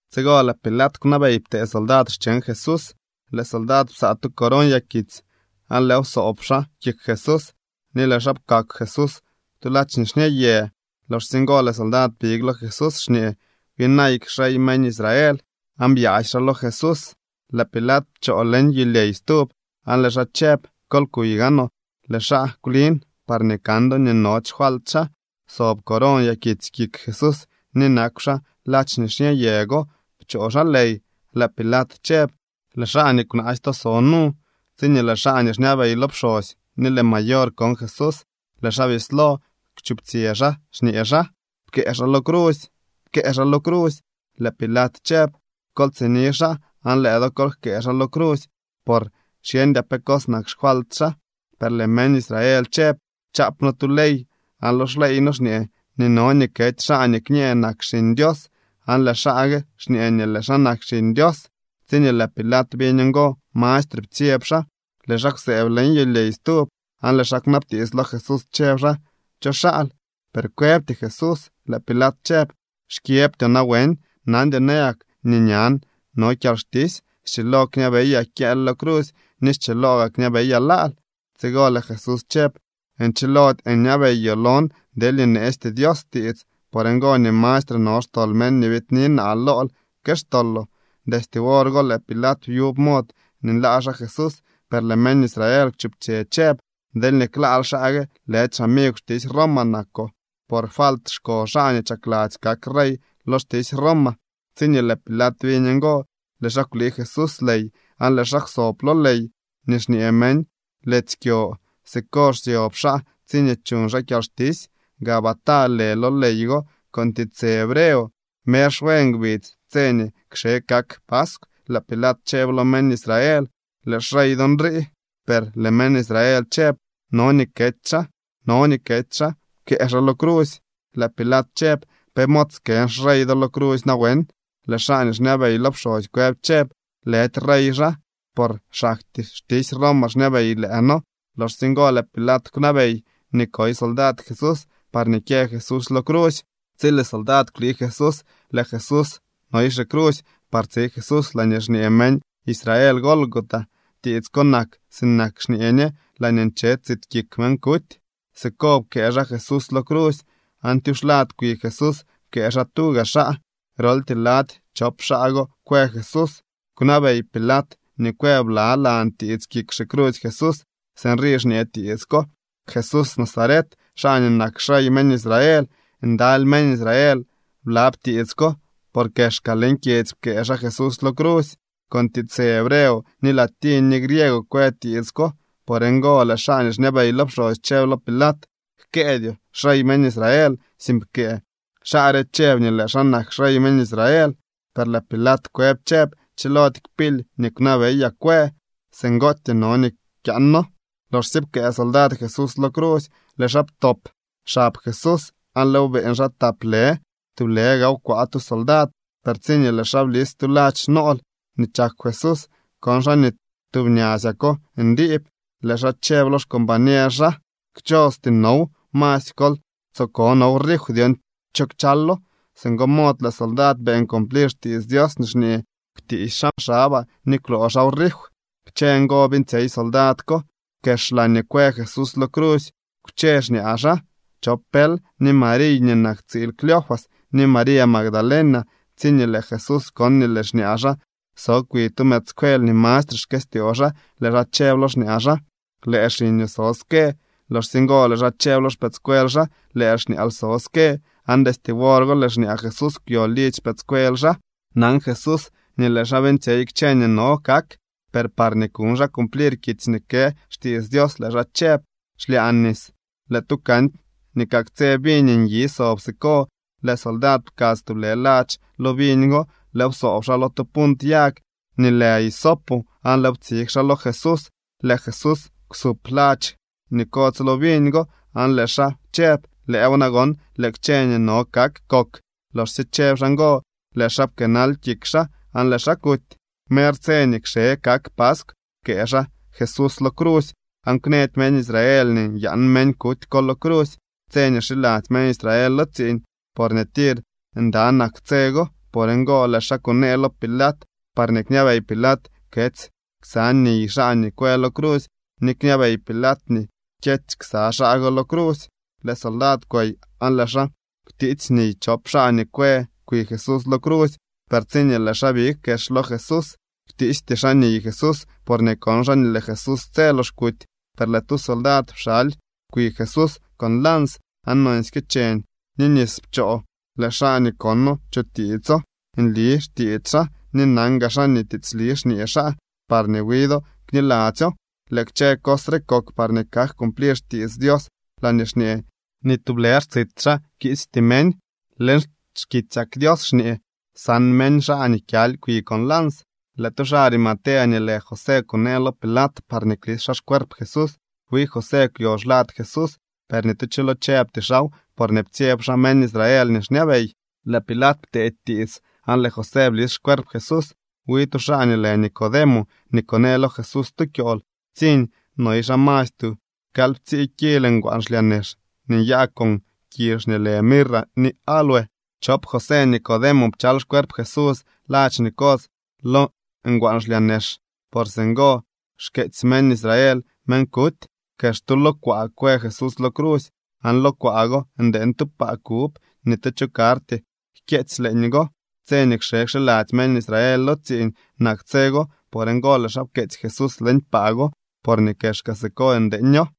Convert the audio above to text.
Tsigo lëë Pilat kwnabey ptee soldad cheñ Jesús. Lëë soldad psaa tu coron yakitsy aan lëëw psoob xaa kik Jesús ni lëë xaa pkakw Jesús tu ladx nixñë yë. Loxsye ngo lëë soldad big lo Jesús xñee: —¡Byinayk xrey meñ Israel! Aan byaasy xaa lo Jesús. Lëë Pilat pchoo leñ yulyey stub aan lëë xaa chëb: —Kol kuy gaanoo, lëë xaa kwlin parñee kan do nii nody xfalt xaa. Sob coron yakitsy kik Jesús ni nakw xaa ladx nixñë yë go pchoo xaa ley. Lëë Pilat chëb: —¡Lëë xaa nii kwnaasy to so nu! Tsiñee lëë xaa nii xñabey lo pxosy ni lëë mayor kon Jesús, lëë xaa bislo kwchuptsyë xaa, xñee xaa: —¡Pkëë xaa lo crusy! ¡Pkëë xaa lo crusy! Lëë Pilat chëb: —Kol tsini xaa aan lëë do kol jkëë xaa lo crusy por xyeñdyaa pe cos nak xfalt xaa. Per lëë meñ Israel chëb: —Chaap noo tu ley aan lo xleey noo xñee nii no nii kety xaa nii kñee nak Xiñ Dios. Aan lëë xaa gue xñee nii lëë xaa nak Xiñ Dios. Tsiñee lëë Pilat biñ ngo, mastre ptsyeb xaa. Lëë xaa kwsëëb leñ yulyey stub, aan lëë xaa kwnabtiits lo Jesús chëb xaa: —¿Cho xaal? Per kwëbty Jesús. Lëë Pilat chëb: —¿Xkyëbtyoo nawen? ¿Nandyoo nayak nii ñan no kyalxtisy? Schilo kñabeyaa kyëël lo crusy ni schiloo gaa kñabeyaa laal. Tsigo lëë Jesús chëb: —Nchilody nyabeyoo lon deelñee neesty Dios tiits. Por ngo nii mastre no xtol meñ nii biidni naa lool que xtoloo. Destye wor go lëë Pilat byub mod nii nlaa xaa Jesús, per lëë meñ Israel kwchuptsyë chëb: —¡Deelñee klaal xaa gue, lëdy xamigw xtisy Roma nakoo! ¡Por falt xko xaa nii chakladzy kak rey lo xtisy Roma! Tsiñee lëë Pilat biñ ngo, lëë xaa kwlii Jesús ley aan lëë xaa kwsob lo ley nii xñee meñ Letsy Kyo. Siko xsyob xaa tsiñee chuñ xaa kyalxtisy. Gabatá lë lo ley go con tiitsë hebreo. Mer xwe ngbidz tse nii kxe kak paskw, lëë Pilat chëb lo meñ Israel: —¡Lëë xrey do nrii! Per lëë meñ Israel chëb: —¡No nii kety xaa! ¡No nii kety xaa! ¡Pkëë xaa lo crusy! Lëë Pilat chëb: —¿Pe mod skën xrey do lo crusy nawen? Lëë xaa nii xñabey lo pxosy kwëb chëb: —Lëdy rey xaa, por xaktyee xtisy Roma xñabey lëë noo. Loxsye ngo lëë Pilat kwnabey nii koy soldad Jesús parñee kyë Jesús lo crusy. Tsi lëë soldad kwlii Jesús, lëë Jesús noy xicrusy par tsi Jesús laañee xñee meñ Israel Gólgota. (Tiits ko nak sinak nii xñee ñe: Laañee nche tsit kik meñ kuty.) Siko pkëë xaa Jesús lo crusy, aan tyuxlad kwi Jesús pkëë xaa tuga xaa. Groltyee lady chop xaa go kwë Jesús. Kwnabey Pilat nii kwë blalan tiits kik xicrusy Jesús. Sinrii xñee tiits ko: “Jesús Nazaret, xaa nii nak xrey meñ Israel.” Ndaly meñ Israel blab tiits ko, por kexka leñ kyedzy pkëë xaa Jesús lo crusy. Con tiitsë hebreo ni latiñ ni griego kwë tiits ko. Por ngo lëë xaa nii xñabey lo pxosy chëb lo Pilat: —Jkëëdyoo: “Xrey meñ Israel”, sink pkëë: “Xaa re chëb nii lëë xaa nak xrey meñ Israel.” Per lëë Pilat kwëb chëb: —Chilody kpily nii kwnabeyaa kwë. Singootyee no nii kyaano. Loxsye pkëë soldad Jesús lo crusy, lëë xaa ptop xab Jesús aan lëëw beeñ xaa tap lë, tublë gaaw kwaa tu soldad. Per tsiñee lëë xaa blis tu ladx nool nii chakw Jesús, kon xaa nii tub ñasyako ndiib. Lëë xaa chëb lo xcombañer xaa: —Kchosty now. Masy kol tsoo ko now rif dyon cho kchalo. Singo mod lëë soldad beeñ cumplir xtiits Dios nii xñee: “Kwtiisy xaa xabaa ni kwloo xaaw rif.” Kchë ngo beeñtsyey soldad ko. Kex laañee kwë Jesús lo crusy kwche xñaa xaa chop pël, ni Mariy nii nak tsiil Cleofas, ni María Magdalena. Tsiñee lëë Jesús kon nii lëë xñaa xaa so kwi tu mëëdscuel nii mastre xkëstyoo xaa, lëë xaa chëb lo xñaa xaa: —Lëë xiñoo so ske. Loxsye ngo lëë xaa chëb lo xpëëdscuel xaa: —Lëë xñaal so ske. Aan destye wor go lëë xñaa Jesús kwyo lidzy xpëëdscuel xaa. Nan Jesús nii lëë xaa beeñtsyey kchë nii no kak, per parñee kuñ xaa cumplir kitsy nii kë xtiits Dios, lëë xaa chëb: —Xlyaan nis. Lëë tu canty nii kaktsë viñ nyi sob siko. Lëë soldad pkadz tublë ladx lo viñ go, lëëw psoob xaa lo tu punt yag nii lë hisopo, aan lëëw ptsig xaa lo Jesús. Lëë Jesús kwsup ladx nii kodz lo viñ go aan lëë xaa chëb: —Lëëw nagon, lëë kchë nii no kak kok. Loxsye chëb xaa ngo, lëë xaa pkëënal kik xaa aan lëë xaa kuty. Mer tse nii kxe kak paskw pkëë xaa Jesús lo crusy, aan kwnëdy meñ Israel nii nyaan meñ kuty ko lo crusy tse nii xiladzy meñ Israel lo tsiiñ, porñee tir nda nak tse go. Por ngo lëë xaa kunee lo Pilat parñee kñabey Pilat ketsy ksa niy xaa nii kwë lo crusy ni kñabey Pilat nii kyety ksa xaa go lo crusy. Lëë soldad kwey aan lëë xaa kwtiitsy niy chop xaa nii kwë kwi Jesús lo crusy. Per tsiñee lëë xaa big kex lo Jesús, kwtiisty xaa niy Jesús, porñee kon xaa nii lëë Jesús tse lox kuty. Per lëë tu soldad pxaly kwi Jesús con lans, aan nonsyke cheñ ni nis pchoo. Lëë xaa nii kono chutiitso. Nli xtiits xaa, ni nan gaa xaa nii tiitsli xñee xaa parñee wi do kniladzyo. Lëë kchë cos re kok parñee kak cumplir xkitsy Dios laañee xñee: “Ni tublë xtsit xaa kiisty meñ.” Leñ xkitsyak Dios xñee: “San meñ xaa nii kyaly kwi con lans.” Lëë tu xaa Arimatea nii lë José kunee lo Pilat parñee klis xaa xcuerp Jesús. Wi José kwyo xlad Jesús, per ni tu cho lo chëbty xaaw, porñee ptsyeb xaa meñ Israel nii xñabey. Lëë Pilat pteedy tiits, aan lëë José blis xcuerp Jesús. Wi tu xaa nii lë Nicodemo, nii kunee lo Jesús tu kyool, ptsiñ. Noy xaa masy tu kalyptsii kil ngwaan xlyaa nex nii nyaa con kizh nii lë mirra ni áloe. Chop José Nicodemo pchal xcuerp Jesús ladx nii kodz lo ngwaan xlyaa nex, por singo xkeetsy meñ Israel meñ kuty. Kex tu lo kwaa kwë Jesús lo crusy, aan lo kwaa go ndeeñ tu paa kub. Ni tu cho karty jkyeetsy leeñgo. Tse nii kxe kxiladzy meñ Israel lo tsiiñ nak tse go. Por ngo lëë xaa pkeetsy Jesús leñ paa go, porñee kexka siko ndeeño.